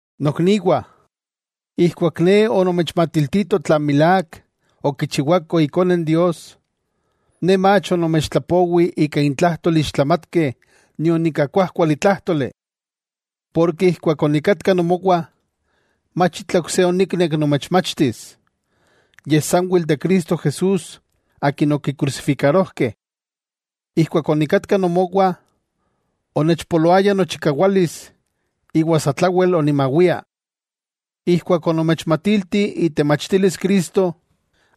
Nokniwah, ijkuak ne onomechmatiltito tlan milák okichiwako Ikone Dios, ne mach onomechtlapowi ika intlajtol ixtlamatkeh nion ika kuájkuali tlájtoli. Porke ijkuak onikatka nomowah, mach itla ok se oniknek nomechmachtis, yej sanwel de Cristo Jesús Akin okikrusifikarojkeh. Ijkuak onikatka nomowah onechpoloaya nochikawalis iwa satlawel onimawia. Ijkuak onomechmatilti itemachtilis Cristo,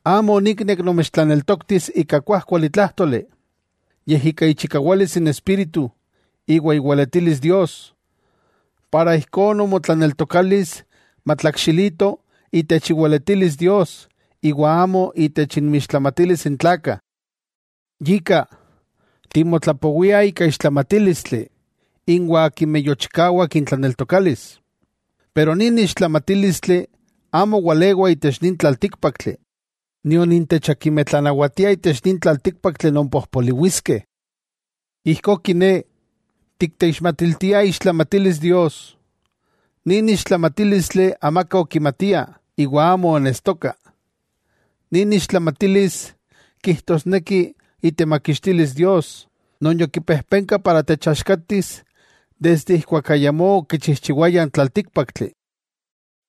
amo oniknek nomechtlaneltoktis ika kuajkuali tlájtoli, yej ika ichikawalis n Espíritu iwa iweletilis Dios, para ijkó nomotlaneltokalis matlakxilito itech iweletilis Dios iwa amo itech inmixtlamatilis n tlakah. Yika, timotlapowiah ika ixtlamatílistli inwah akimeh yochikawak n tlaneltokalis. Pero nin ixtlamatílistli amo walewa itech nin tlaltíkpaktli, nion intech akimeh tlanawatiah itech nin tlaltíkpaktli non pojpoliwiskeh. Ijkó kiné, tikteixmatiltiah iixtlamatilis Dios, nin ixtlamatílistli amaka okimatia iwa amo onestoka, nin ixtlamatilis kijtosneki itemakixtilis Dios, non yokipejpenka para techaxkatis desde ijkuak ayamó okichijchiwaya n tlaltíkpaktli.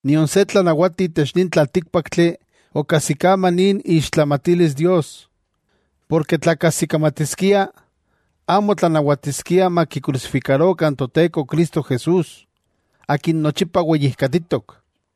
Nion se tlanawati itech nin tlaltíkpaktli okajsikama nin iixtlamatilis Dios. Porke tla kajsikamatiskiah, amo tlanawatiskiah makikrusifikarokah n Toteko Cristo Jesús, Akin nochipa weyijkatitok.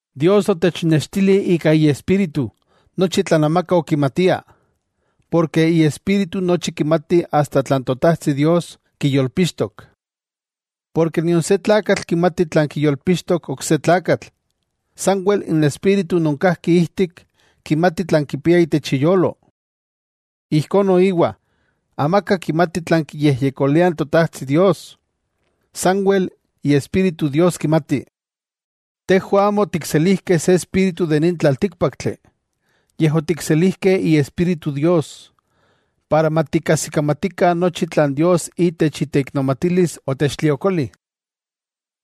Dios otechnextili ika Iespíritu nochi tlan amaka okimatia, porke Iespíritu nochi kimati asta tlan Totajtsi Dios kiyolpixtok. Porke nion se tlakatl kimati tlan kiyolpixtok ok se tlakatl, sanwel n espíritu non kajki ijtik kimati tlan kipia itech iyolo. Ijkó noiwa, amaka kimati tlan kiyejyekolia n Totajtsi Dios, sanwel Iespíritu Dios kimati. Tejwah amo otikselijkeh se espíritu de nin tlaltíkpaktli, yej otikselijkeh Iespíritu Dios, para matikajsikamatikah nochi tlan Dios itech iteiknomatilis otechtliokoli.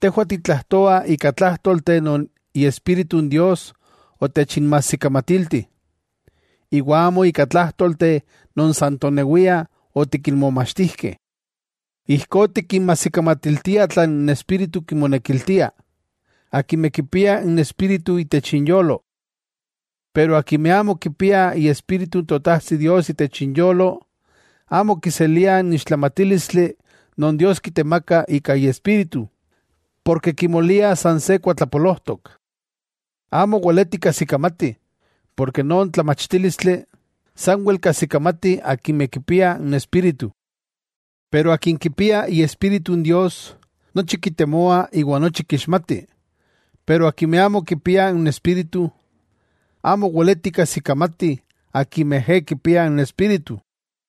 Tejwah titlajtoah ika tlájtolteh non Iespíritu n Dios otechinmajsikamatilti, iwa amo ika tlájtolteh non san tonewiah otikinmomachtijkeh. Ijkó tikinmajsikamatiltiah tlan n Espíritu kimonekiltia, akimeh kipiah n Espíritu itech inyolo. Pero akimeh amo kipiah Iespíritu n Totajtsi Dios itech inyolo, amo kiseliah n ixtlamatílistli non Dios kitemaka ika Iespíritu, porke kimoliah san se kuatlapolojtok. Amo weletih kajsikamatih, porke non tlamachtílistli sanwel kajsikamatih akimeh kipiah n Espíritu. Pero akin kipia Iespíritu n Dios, nochi kitemoa iwa nochi kixmatih. Pero akimeh amo kipiah n Espíritu, amo weleti kajsikamati akimeh ejé kipiah n Espíritu.